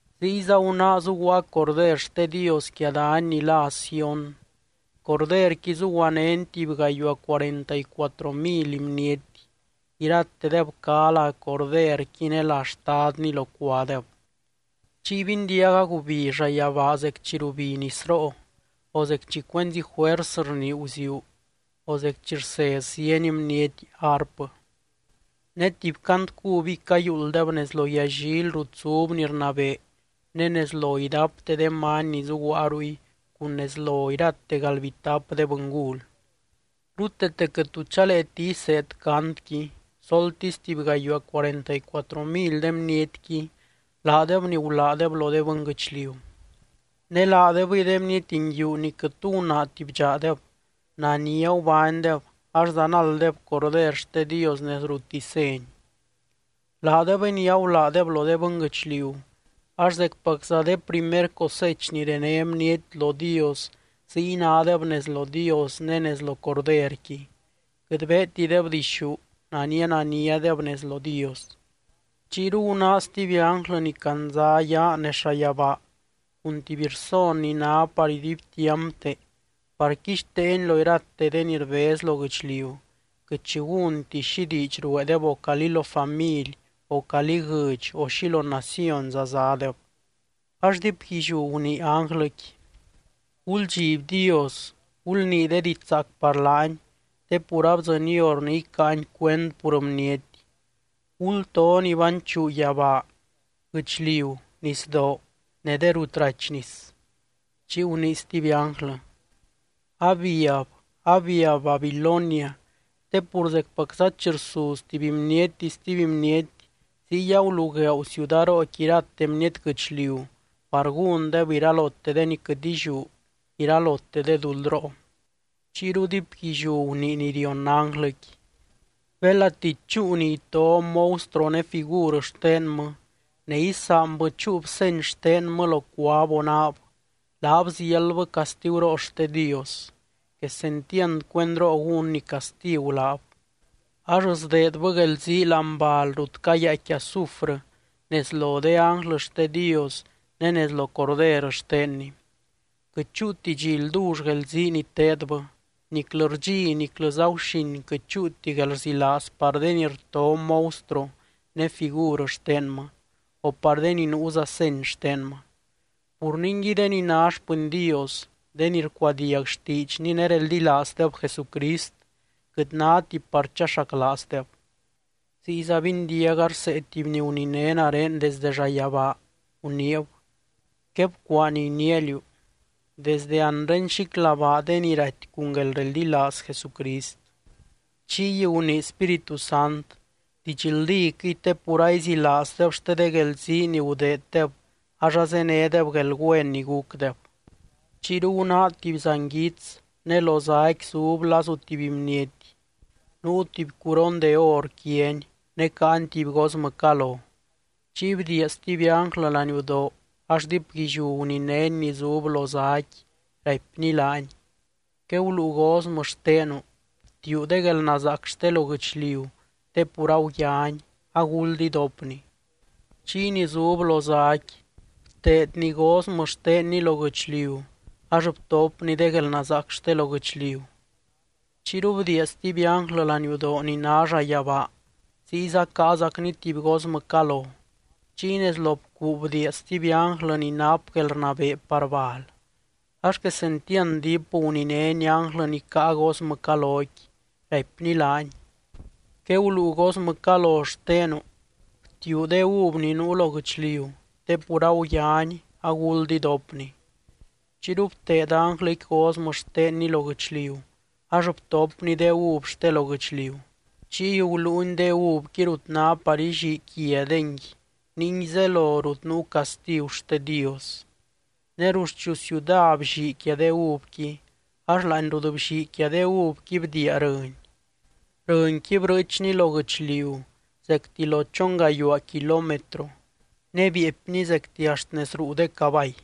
Ziyza gunáa zuguaa Corder xte Dios quia dany ni lá Sión. Corderqui zuguanény tuby gayuaa cuarenta y cuatro mily bniety, iratedeb cá lá Corderqui ne lá Xtadny locuadeb. Chiy bindiaga gubi llayabaa zec chi rubi nisroo, o zec chi cuenzi juers rnii guziuu, o zec chi rsez zieny bniety arpɨ. Ne tuby cant cubiy cayuulddeb nez lo yallily rut zub ni rnabee ne nez lo idapte de many ni zuguaa ruy cun nez lo irate galdbitap de bɨngul. Ruteete quɨtru tu chaleeti iseed cantqui, soltisy tuby gayuaa cuarenta y cuatro mily de bnietqui, laadeb ni guládeb lo de bɨnguɨchliu. Ne laadebɨy de bniety nguiu ni quɨt tu gunaati bdxaadeb, nania gubánydeb, ax zanalddeb Corder xte Dios nez ruttisy zény. Laadebɨy ni aguládeb lo de bɨnguɨchliu, ax zecpacza de primer cosech ni rené bniety lo Dios ziy nádeb nez lo Dios ne nez lo Corderqui. Quɨt bétideb dixú, nania, naniadeb nez lo Dios. Chiyru gunáa stuby ánglɨ ni candza yaa nez llayabaa cun tuby rson ni ná par iduibtiampte par quixteenyni lo irate de ni rbez lo guɨchliu, quɨt xi gúnti xi diidx rueedeb, o calí lo family, o calí guɨdx, o xi lo nacionza zádeb. Ax diipguilliú gunii ánglɨqui: —Guldxiby Dios, gulnii de diidx zaac par laany, te pur abdzɨny hor ni icáany cuend pur bniety. Gulto ni banchuu yabaa, guɨchliu, nisdoo ne de rut rachy nis. Chiy gunii stuby ánglɨ: —Abiab, abiab Babilonia te pur zecpacza chi rsuz tuby bniety stuby bniety, ziy agulugueeu ciudarooqui irate bniety guɨchliu par gúndeb iralote de ni quɨt illiú, iralote de duldroo. Chiyru diipguilliú gunii ni rion ánglɨqui: —Belati chúu ni ito monstruo ne figur xtenmɨ, ne isaanbɨ chúub seny xtenmɨ locuab o naab, laab ziáldbɨ castiguroo xte Dios, quesentiand cuendroo gúnny castigu laab. Ax sdeedbɨ guelzii láani bal rut cayaaicqui azufrɨ nez lo de ánglɨ xte Dios ne nez lo Corder xtenny. Quɨt chúuti dxi ldull guelzii ni teedbɨ. Niclɨ rdxi niclɨza guxin quɨt chúuti guelrzilaaz par de ni rto monstruo ne figur xtenmɨ, o par de ni nuuza seny xtenmɨ. Pur ningui, de ni ná xpɨny Dios de ni rcuadiag xtiidxny ne reldilaazdeb Jesucrist, quɨt náti par chaxaclaazdeb. Ziyza bindiaga rsee tuby ni guniné nare desde llayabaa, guniib: —Quebcuaa ni iniia liú: “Desdɨ anre xíclabaa de ni raty cun guelreldilaaz Jesucrist.” Chiy gunii Spíritu Sant: “Didxldíquɨy, te pur aizilaazdeb xte de guelzii ni gudeeddeb ax azénedeb guelgüen ni gucdeb.” Chiyru gunáa tuby zá nguits ne lo záqui zub lazu tuby bniety. Nuu tuby curon de or quiany ne caany tuby gozmɨ calo. Chiy bdiia stuby ánglɨ laniudoo ax diipguilliú guninény ni zub lo záqui, raipny laany: —Queguluu gozmɨ xtenu, btiuu de guelnazaac xte lo guɨchliu, te pur aguyany ax aguld idopni. Chiy ni zub lo záqui bteedny gozmɨ xtenny lo guɨchliu ax btopny de guelnazaac xte lo guɨchliu. Chiyru bdiia stuby ánglɨ laniudoo ni ná llayabaa, ziyza caazacny tuby gozmɨ calo. Chiy nez lo bcuu bdiia stuby ánglɨ ni nap guelrnabee par bal, ax quesentiand diip guninény ánglɨ ni caa gozmɨ caloqui, raipny laany: —Queguluu gozmɨ calo xtenu, btiuu de uv ni nuu lo guɨchliu, te pur aguyany ax aguld idopni. Chiyru bteed ánglɨqui gozmɨ xtenny lo guɨchliu ax btopny de uv xte lo guɨchliu. Chiy guluuny de uvqui rut ná par illii quiadengui, niy zelo rut nuu castigu xte Dios. Ne ruxchu ciuda bllii quia de uvqui ax láani rut bllii quia de uvqui bdiia rɨny. Rɨnqui brɨɨchni lo guɨchliu zecti lo chon gayuaa kilómetro, ne bieepni zecti axt nez ruu de cabay.